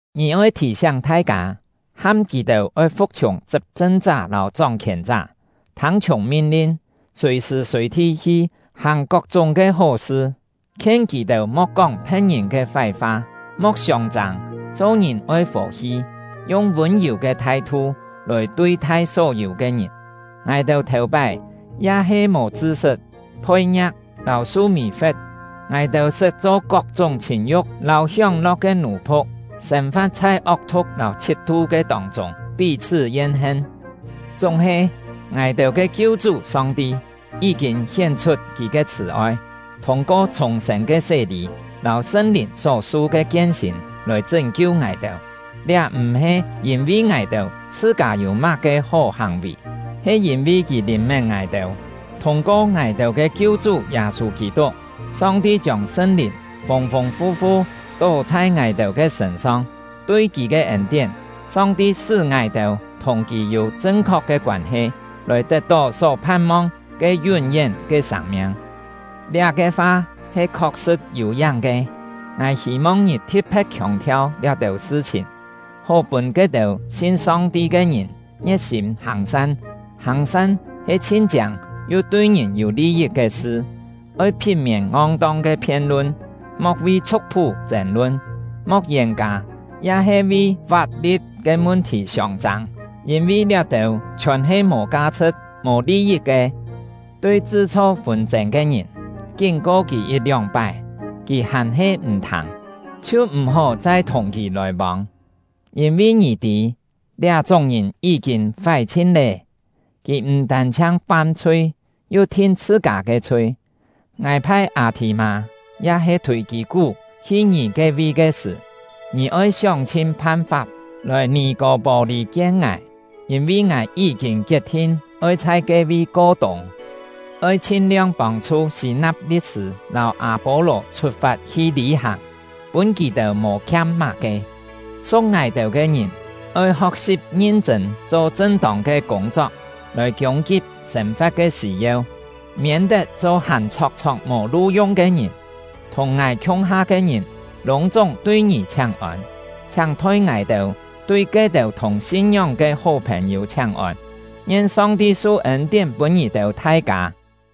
Ngì oi thì-siáng thai-kâ, ham kì-têu oi fu̍k-chhiùng chṳp-chṳn-chá lâu chóng-khièn-chá, thâng-chhiùng min-lin, sùi-sṳ̀ sùi-thi hi-hàng kok-chúng ke hó-sṳ. Khien kì-têu mo̍k kóng phe̍t-ngìn ke fái-fa, mo̍k siông-châng; cho-ngìn oi fò-hi, yung vûn-yù ke thai-thu lòi tui-thai só-yû ke ngìn. Ngài-têu thèu-pái ya he mò chṳ-sṳt, phoi-ngia̍k, lâu su mì-fe̍t; ngài-têu sṳt cho kok-chúng chhìn-yu̍k lâu hióng-lo̍k ke nù-phu̍k, sên-fa̍t chhai ok-thu̍k lâu chhit-tu ke tông-chûng, pí-chhṳ́ yen-hen. Chúng-he, ngài-têu ke Kiu-chú Song-ti yí-kîn hién-chhut Kì ke chhṳ̀-oi, thûng-ko chhùng-sên ke sé-lî lâu Sṳn-Lìn só-su ke kien-sîn lòi chṳ́n-kiu ngài-têu; liá m̀-he yîn-vi ngài-têu chhṳ-kâ yû má-ke hó hàng-vì, he yîn-vi Kì lìn-mén ngài-têu. Thûng-ko ngài-têu ke Kiu-chú Yâ-sû Kî-tuk, Song-ti chiông Sṳn-Lìn fûng-fûng fu-fu tó chhai ngài-têu ke sṳ̂n-song; tui Kì ke ên-tién, Song-ti sṳ́ ngài-têu thùng Kì yû chṳn-khok ke koân-he, lòi tet-tó só phan-mong ke yún-yén ke sâng-miang. Liá-ke fa he khok-sṳ̍t yû-yáng ke. Ngài hî-mong ngì thi̍t-phe̍t khiòng-thiau liá-têu sṳ-chhìn, hó pûn ke-têu sin Song-ti ke ngìn ngie̍t-sîm hàng-san; hàng-san he chhin chiâng yu tui ngìn yû li-yit ke sṳ. Oi phit-miên ngong-tong ke phien-lun, mo̍k vi chhu̍k-phú chên-lun, mo̍k yên-kâ ya-he vi fap-li̍t ke mun-thì siông-châng; yîn-vi liá-têu chhiòn he mò ka-chhṳ̍t, mò li-yit ke. Tui chṳ-chho fûn-chên ke ngìn, kín-ko kì yit-lióng-pái, kì hàn-he m̀ thâng, chhiu m̀-hó chai thùng kì lòi-vông. Yîn-vi ngì tî, liá-chúng ngìn yí-kîn fái-chhin lé, kì m̀ tân-chhiang fam-chhui, yu thin chhṳ-kâ ke chhui. Ngài phai Â-thì-mâ ya-he Thûi-kî-kú hi ngì ke-vi ke sṳ̀, ngì oi sióng-chhin phan-fap lòi Nì-kô-pô-lî kien ngài, yîn-vi ngài yí-kîn kiet-thin oi chhai ke-vi ko-tûng. Oi chhin-liong pông-chhu Sî-na̍p li̍t-sṳ̂ lâu Â-pô-lò chhut-fat hi lî-hàng, pûn kì-têu mò khiam má-ke. Su̍k ngài-têu ke ngìn oi ho̍k-si̍p ngin-chṳ̂n cho chṳn-tông ke kûng-chok, lòi kiûng-kip sên-fa̍t ke sî-yeu, miên-tet cho hàn chhok-chhok mò lu-yung ke ngìn. Thùng ngài khiung-ha ke ngìn lûng-chúng tui ngì chhiáng-ôn. Chhiáng thoi ngài-têu tui ke-têu thùng sin-ngióng ke hó phèn-yû chhiáng-ôn. Ngien Song-ti su ên-tién pûn ngì-têu thai-kâ!